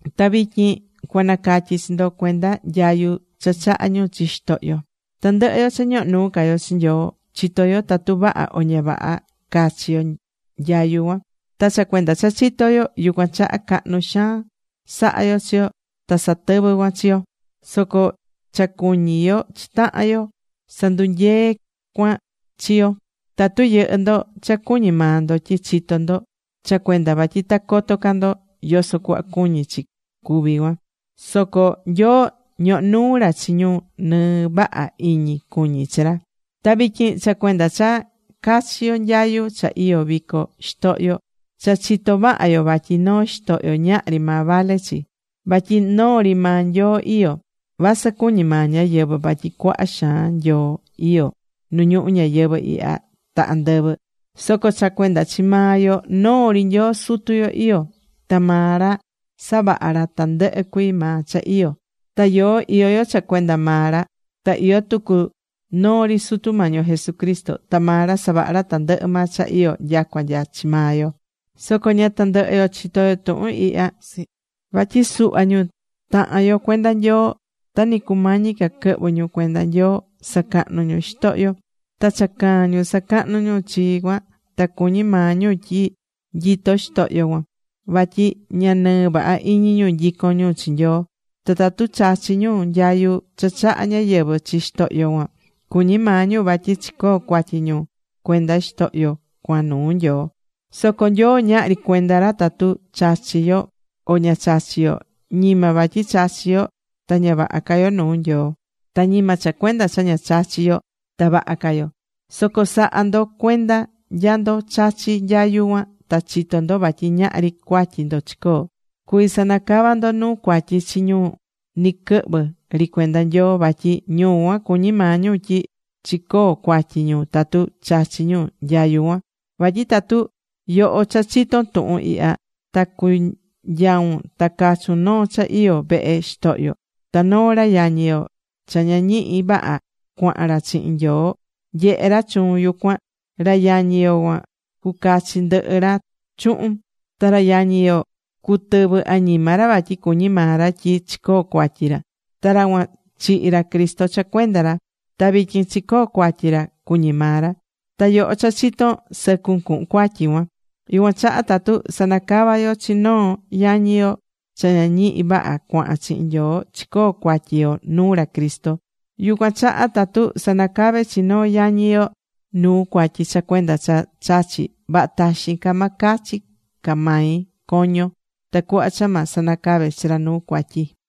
Ta vityin cuanacatyi chi ndo cuenda nyayu cha chahá ñu chi xitohyo. Tandɨhɨ yo cha ñohó nuu ca yo chi Nyoo, chitó yo tatu vaha o ña vaha cachi yo nyayu cuan. Ta cha cuenda cha chitó yo, yucuan chaha cahnu xaan sahá yo chi yo ta satɨvɨ́ cuan chi yo. Soco cha cuñí yo chi tahan yo sandunyeé cuan chi yo. Tatu yɨhɨ́ ndo cha cuñí maa ndo tyi chitó ndo, cha cuenda vatyi ta coto ca ndo yoso cuhva cuñí chi cuví cuan. Soco Nyoo ñohó nuu ra chi ñu nɨɨ vaha iñi cuñí chi ra. Ta vityin cha cuenda cha cachi yo nyayu cha iyó vico xitohyo: cha chitó vaha yo vatyi noo xitohyo ñahri maa vale chi, vatyi noo ri maa Nyoo iyó. Vasɨ cuñí maa ñáyɨvɨ vatyi cuaha xaan Nyoo iyó nu ñuhu ñayɨvɨ̱ ihya ta andɨvɨ, soco cha cuenda chi maa yo noo ri Nyoo Sutu yo iyó. Ta maa ra savaha̱ ra tandɨhɨ cuii maa cha iyó. Ta yoó iyó yo cha cuenda maa ra. Ta iyó tucu noo ri Sutu Mañi yo Jesucristo. Ta maa ra savaha̱ tandɨhɨ maa cha iyó, nyacua nya chi maa yo. Soco ña tandɨhɨ yo chitó yo tuhun ihya. Vatyi suhva ñu tahan yo cuenda Nyoo, ta nɨ cumañi ca quɨhvɨ ñu cuenda Nyoo, sacahnu̱ ñu xitohyo. Ta cha caa̱n ñu sacahnu ñu chi cuan ta cuñí maa ñu tyi nyitó xitohyo cuan. Vatyi ña nɨɨ vaha iñi ñu nyicón ñu chi Nyoo. Ta tatu chachí ñu nyayu cha chahá ñáyɨvɨ chi xitohyo cuan, cuñí maa ñu vatyi chicoó cuatyi ñu cuenda xitohyo cuan nuu Nyoo. Soco Nyoo ñahri cuenda ra tatu chachí yo, o ña chachí yo. Ñima vatyi chachí yo ta ña vaha ca yo nuu Nyoo, ta ñima cha cuenda cha ña chachí yo ta vaha ca yo. Soco sa̱ha ndo cuenda nya ndo chachi nyayu cuan ta chitó ndo vatyi ñahri cuatyi ndo chicoo. Cuví sanacava ndo nuu cuatyi chi ñu ni quɨhvɨ ri cuenda Nyoo, vatyi ñu cuan cuñí maa ñu tyi chicoo cuatyi ñu tatu chachi̱ ñu nyayu cuan. Vatyi tatu yoho cha chiton tuhun ihya, ta cunyaun ta cachun noo cha iyó vehe xitohyo, ta noo ra yañi yo cha ña ñihi vaha cuahán ra chihin Nyoo nyehé ra chuun yucuan, ra yañi yo cuan cucachi ndɨhɨ ra chuhun. Ta ra yañi yo cutɨvɨ añima ra vatyi cuñí maa ra tyi chicoo cuatyi ra. Ta ra cuan chihi̱ ra Cristo cha cuenda ra. Ta vityin chicoo cuatyi ra cuñí maa ra. Ta yoho cha chitón, sɨcun cuhun cuatyi cuan. Yucuan chaha tatu sanacavá yo chi noo yañi yo cha ña ñihí vaha cuahán chihin Nyoo, chicoó cuatyi yo nuu ra Cristo. Yucuan chaha tatu sanacavé chi noo yañi yo nuu cuatyi cha cuenda cha chachí, vaha taxin ca ma cachi ca mai coño, tacuhva cha ma sanacave chi ra nuu cuatyi.